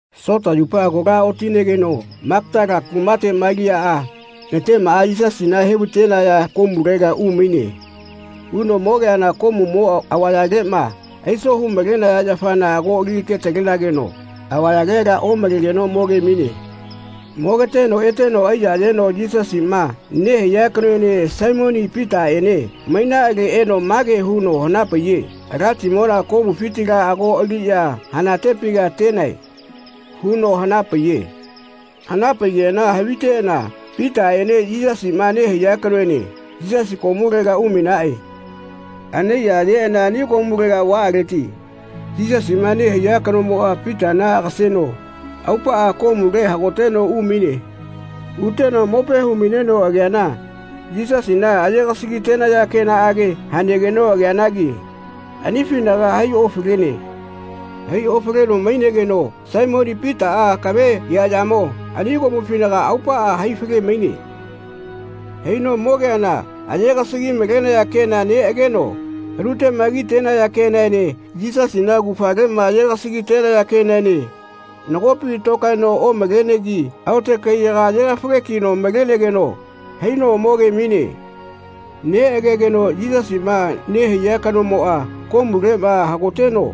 Sota yupa kola otinegeno Magatala kumate Maliaꞌa natemaꞌa Yisasina he-vai-tenaya komulega umaine. Uno mogeana komumo avayaleꞌma aiso hu-malenaya yafana ago alike-li-talenageno avayalela omalegeno moge-maine. Mogeteno eteno aiya-yeno Yisasiꞌma nehaiya kanoene Saimoni Pitaꞌene mainaꞌale eno mage huno hana-paiye “Alatimona komufitila ago aliꞌya hanatepi atenae.” huno hana-paiye. Hana-paigeꞌana haviteꞌana Pitaꞌene Yisasiꞌma nehaiya kanoene Yisasi komulega umainaꞌe. Anaiya-yeꞌana ani komulega vaꞌaleti Yisasiꞌma nehaiya kanomoꞌa Pitana agaseno aupaꞌa komule hagoteno umaine. Uteno mope hu-maineno ageana Yisasina aye-gasagi-tenaya kenaꞌage hanegeno ageanagi anifinaga hai-ofalene. Hai-ofaleno mainegeno Saimoni Pitaꞌa akave eaꞌyamo ani komufinaga aupaꞌa hai-fale-maine. Haino mogeana nagoꞌa aye-gasagi-tenaya kena neꞌageno anuteꞌma ki-tenaya kenaene Yisasina augafaleꞌma aye-gasagi-tenaya kenaene nagopi tokaeno omalenegi aote kaiyaga aye-gafage-kino malenegeno haino moge-maine. Neꞌagegeno Yisasiꞌma nehaiya kanomoꞌa komuleꞌma hagoteno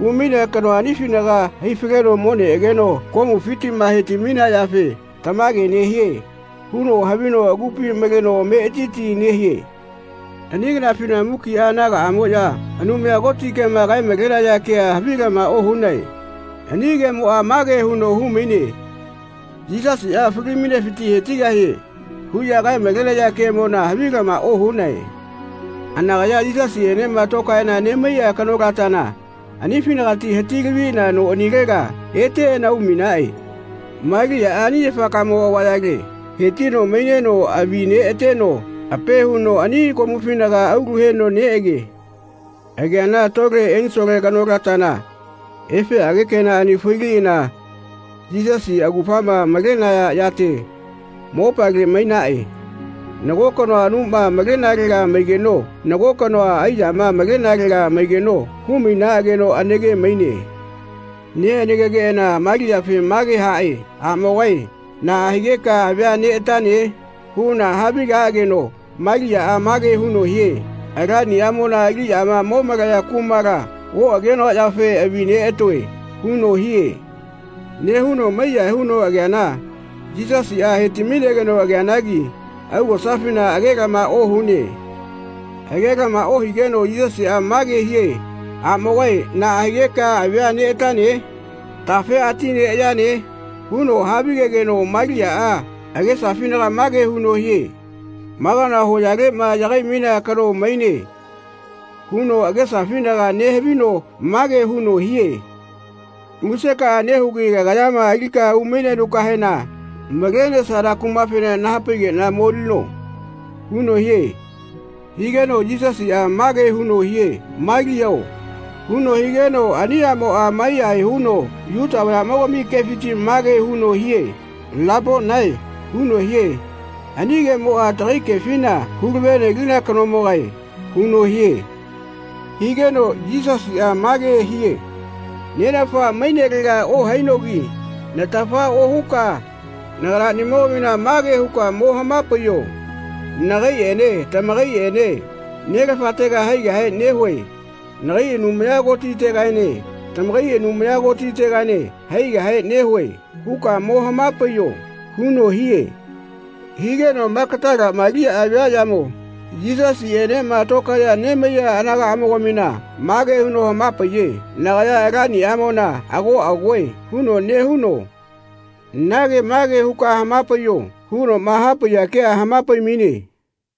umainea kanoa anifinaga hai-faleno mo neꞌageno komufitiꞌma he-ti-mainea yafe “Tamage nehie.” huno havino agupi maleno ametiti nehie. Ani kanafina mukiꞌa anagaꞌamoꞌya Anumaya Koti kema kae-malenaya kea havilama ohunae. Ani kemoꞌa mage huno hu-maine “Yisasiꞌa fali-mainesifiti he-tigahie.” huꞌya kae-malenaya kemona havilama ohunae. Anakaya Yisasiꞌenema tokaeꞌana nemaiꞌa kanolatana anifinagati hati-laviꞌana noꞌanilega eteꞌana umainaꞌe. Maliaꞌa ani yafakamo avayale he-tino maineno avi neꞌateno ape huno ani komufinaga aulu heno neꞌage. Ageana tole ensole kanolatana efeꞌage kenaꞌani failiꞌana Yisasi augafama malenaya yate mopale mainaꞌe. Nago kanoa anuma malenalega maigeno nago kanoa aiyama malenalega maigeno hu-mainaꞌageno anake-maine. Neꞌanakegeꞌana Maliafe mage haꞌe “Aꞌmogae naꞌa higeka avia neꞌatane?” huꞌana havigaꞌageno Maliaꞌa mage huno hie “Alaniꞌamona aliꞌyama mo malaya kumala oꞌagenoa yafe avi neꞌatoe.” huno hie. Nehuno mai-yahae huno ageana Yisasiꞌa he-ti-mainegeno ageanagi augosafina agelama ohune. Agelama ohigeno Yisasiꞌa mage hie “Aꞌmogae naꞌa higeka avia neꞌatane? Tafe ati neꞌayane?” huno havigegeno Maliaꞌa agesafinaga mage huno hie “Ma kanoa hoyaleꞌma yagai-mainea kano maine.” huno agesafinaga nehavino mage huno hie “Musekaꞌa nehugi kagayama alika umainenukahena malenesana kumafena naha-paigeꞌna molino.” huno hie. Higeno Yisasiꞌa mage huno hie “Maliao.” huno higeno ani aꞌmoꞌa maiyahae huno Yuta vayaꞌmogami kefiti mage huno hie “Laponae.” huno hie. Ani kemoꞌa takai kefina “Hu-lave-nelina kanomogae.” huno hie. Higeno Yisasiꞌa mage hie “Nenafa mainelega ohainogi natafa ohuka naganaꞌnimogamina mage huka mo hama-paiyo ‘Nagaiꞌene tamakaiꞌene Nelafatega haigahe nehue. Nagai Anumaya Kotitegaene tamakai Anumaya Kotitegaene haigahe nehue.’ huꞌka mo hama-paiyo.” huno hie. Higeno Magatala Maliaꞌa viaꞌyamo Yisasiꞌenema tokaeꞌya nemaiya anagaꞌamogamina mage huno hama-paiye “Nagaya Alaniꞌamona ago agoe.” huno nehuno “Nage mage huka hama-paiyo.” hunoꞌma hapaiya kea hama-pai-maine.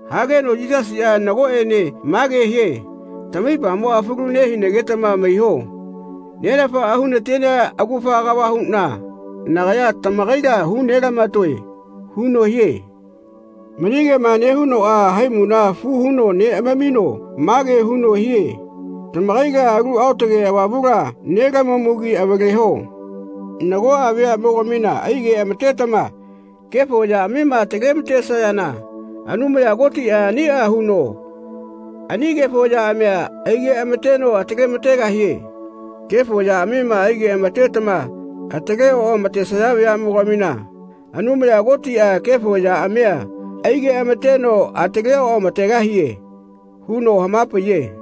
Hageno Yisasiꞌa nagoꞌene mage hie “Tamaipamoꞌa falu nehinagetama maiho. Nenafaꞌa hu-na-tenea augafa kava huꞌna nagaya tamakaila hu-nela-matoe.” huno hie. Mani kema nehunoꞌa haimula fu huno neꞌamamino mage huno hie “Tamakaila Alu Aotage Avamula nelamamugi avaleho. Nagoꞌa veaꞌmogamina ai-geꞌama-tetama kefo yaꞌamima atale-ma-tesayana Anumaya Kotiꞌa aniꞌa huno ani kefo yaꞌamia ai-geꞌama-teno atale-ma-tegahie. Kefo yaꞌamima ai-geꞌama-tetama atale oꞌamatesaya veaꞌmogamina Anumaya Kotiꞌa kefo yaꞌamia ai-geꞌama-teno atale oꞌama-tegahie.” huno hama-paiye.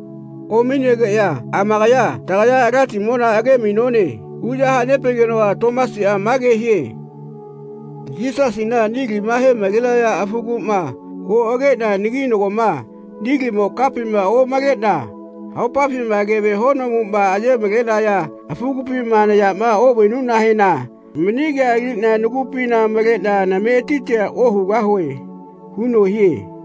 Omainegeꞌya amakaya “Tagaya Alatimona age-mainone.” huꞌya hane-paigenoꞌa Tomasiꞌa mage hie “Yisasina nilima he-malenaya afuguꞌma oꞌageꞌna, naginagoma nilimo kapima omaleꞌna haopafima keve honomuꞌma aye-malenaya afugupima nayama oꞌvainuꞌnahena mani kea aliꞌna nagupina maleꞌna nametitia ohugahue.” huno hie.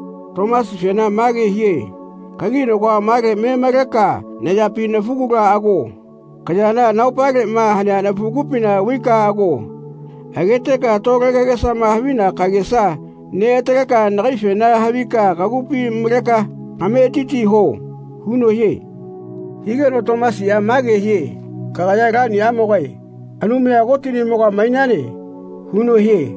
Tomasifena mage hie “Kaginagoa male me maleka nayapi nafugula ago. Kayana nahaopaleꞌma hanea nafugupina vaika ago. Ageteka tole kagesama havina kagesa neꞌataleka nagaifena havika kagupi maleka kametiti huo.” huno hie. Higeno Tomasiꞌa mage hie “Kagaya Alaniꞌamogae Anumaya Kotiꞌnimoga mainane.” huno hie.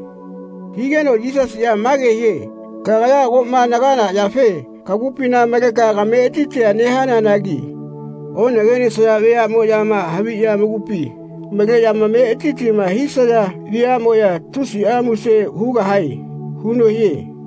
Higeno Yisasiꞌa mage hie “Kagaya agoꞌma nagana yafe kagupina maleka kametitia nehananagi onagenesaya veaꞌnemoꞌyama haviꞌya amakupi maleꞌya amametitima hisaya veaꞌmoꞌya tusiꞌa muse hugahae.” huno hie.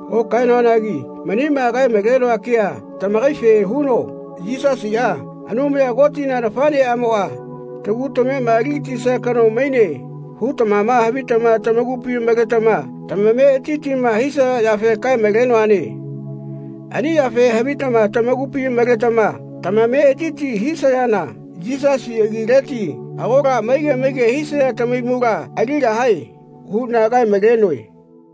Okaenoanagi manima kae-maloa kea tamakaife huno Yisasiꞌa, Anumaya Kotina nafaꞌneꞌamoꞌa, tagu tamema ali-gatisia kano maine hutamama havitama tamakupi maletama tamametitima hisaya yafe kae-malenoane. Ani yafe havitama tamakupi maletama tamametiti hisayana Yisasi agileti agola maige maige hisaya tamahaimula aligahae huꞌna kae-malenoe.